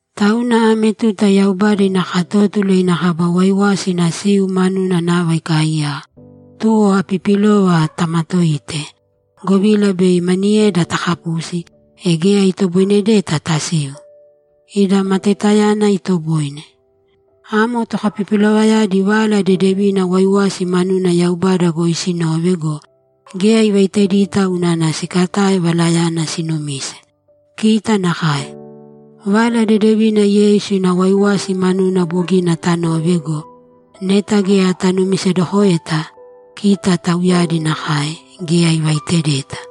Tauna ame tuta Yaubada ina katótula ina kaba waiwasi ina siu manuna nava ikaaiyaka, tuwo apipilova tamatōite, govila bei maniyeda takapusi, e geya itoboinedeta tasiu. Ida matoitayana itoboine. Amo tokapipilovayadi Vala Dedevina waiwasi manuna Yaubada goi sinove go, geya ivaitedita unana sikatae valayana sinumise. Kita nakae. Vala Dedevina Yeisu ina waiwasi manuna bogina tanove go, neta geya tanumisedokoeta, kita tauyadi nakae, geya ivaitedeta.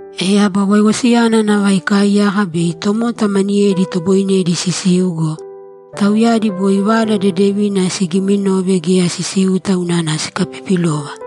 E aba waiwasiyana nava ikaaiyaka bei tomota maniyedi itoboinedi sisiu go, tauyadi boi Vala Dedevina sigiiminove geya sisiuta unana sikapipilova.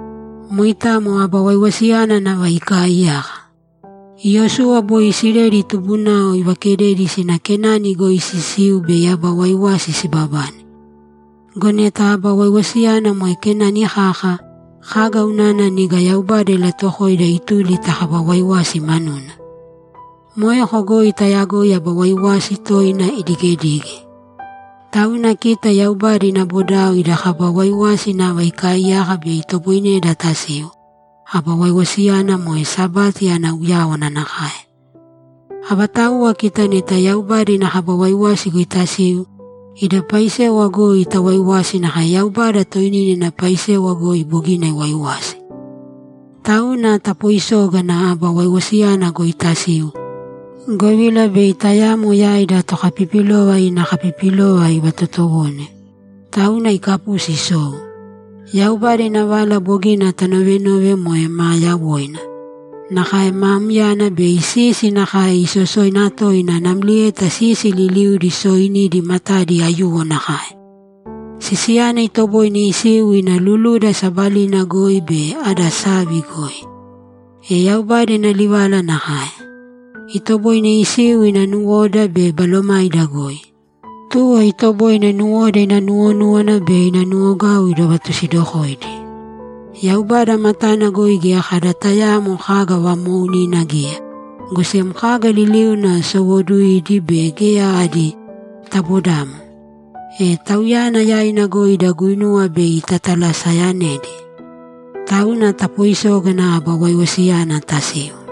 Moitamo aba waiwasi nava ikaaiyaka. Iyosuwa boi Isileli tubunao ivakededi sina Kenani goi sisiu bei aba waiwasi sibabane. Go neta aba waiwasiyana moe Kenani kaka, kaga unana niga Yaubada ilatuwokoida ituli ta kaba waiwasi manuna? Moeko goi tayagoi aba waiwasi toina idigedige. Tauna kita Yaubada ina bodao ida kaba waiwasi nava ikaaiyaka bei itoboineda tasiu, aba waiwasiyana moe Sabati ana uyáwana nakae. Avatauwa kita neta Yaubada ina kaba waiwasi goi tasiu, ida paisewa goi tawaiwasi nakae Yaubada toinina ina paisewa goi bogina iwaiwasi. Tauna tapoisōgana aba waiwasiyana goi tasiu, govila bei tayamo yaida tokapipilova ina kapipilova ivatotowone, tauna ikapusi isou. Yaubada ina vala bogina taanove moe maa yawoina. Nakae maa myana be sisi nakae isosoina toina namlieta sisi liliudi sooinidi matadi aiyuwo nakae. Sisiyana itoboine isiu ina luluda sabalina goi be ada savi goi. E Yaubada ina livala nakae. Itoboine isiu ina nuwoda be balomaida goi. Tuwo itoboine nuwoda ina nuwonúwana be ina nuwogau idovatusidokoidi. Yaubada matana goi geya kada tayaamo kaga vamoounina geya, go sem kaga liliudi sowooduidi be geya adi tabodamo. E Tauyana yaina goi ida guinuwa bei tatalaseyanedi. Tauna tapoisōgana aba waiwasiyana tasiu.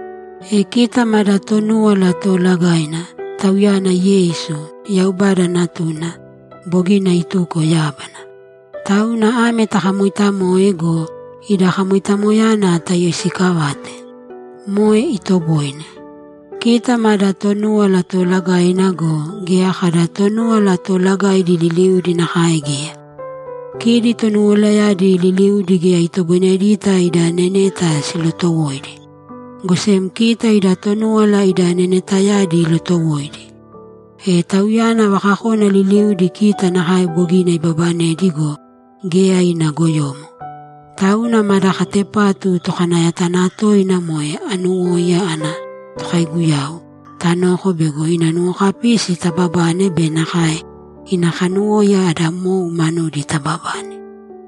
E kita mada Tonúwala Toolagaina; Tauyana Yeisu, Yaubada Natuna, bogina ituko yábana. Tauna ame takamoitamōe go, ida kamoitamoyana tayoisiikavāte. Moe itoboine. Kita mada Tonúwala Toolagaina go, geya kada Tonúwala Toolagaidi liliudi nakae geya. Kidi Tonuwalayadi liliudi geya itoboinedita ida neneta silotowoidi. Go sem kita ida Tonúwala ida nenetayadi ilotowoidi. E Tauyana vakakona liliudi kita nakae bogina ibabanedi go, geya ina goyomo. Tauna mada katepatu Tokanayatanatoina, moe anuwóiya ana Tokaiguyau, tanōko bego ina nuwokapisi tababane be nakae ina kanuwóiya ada mou manudi tababane.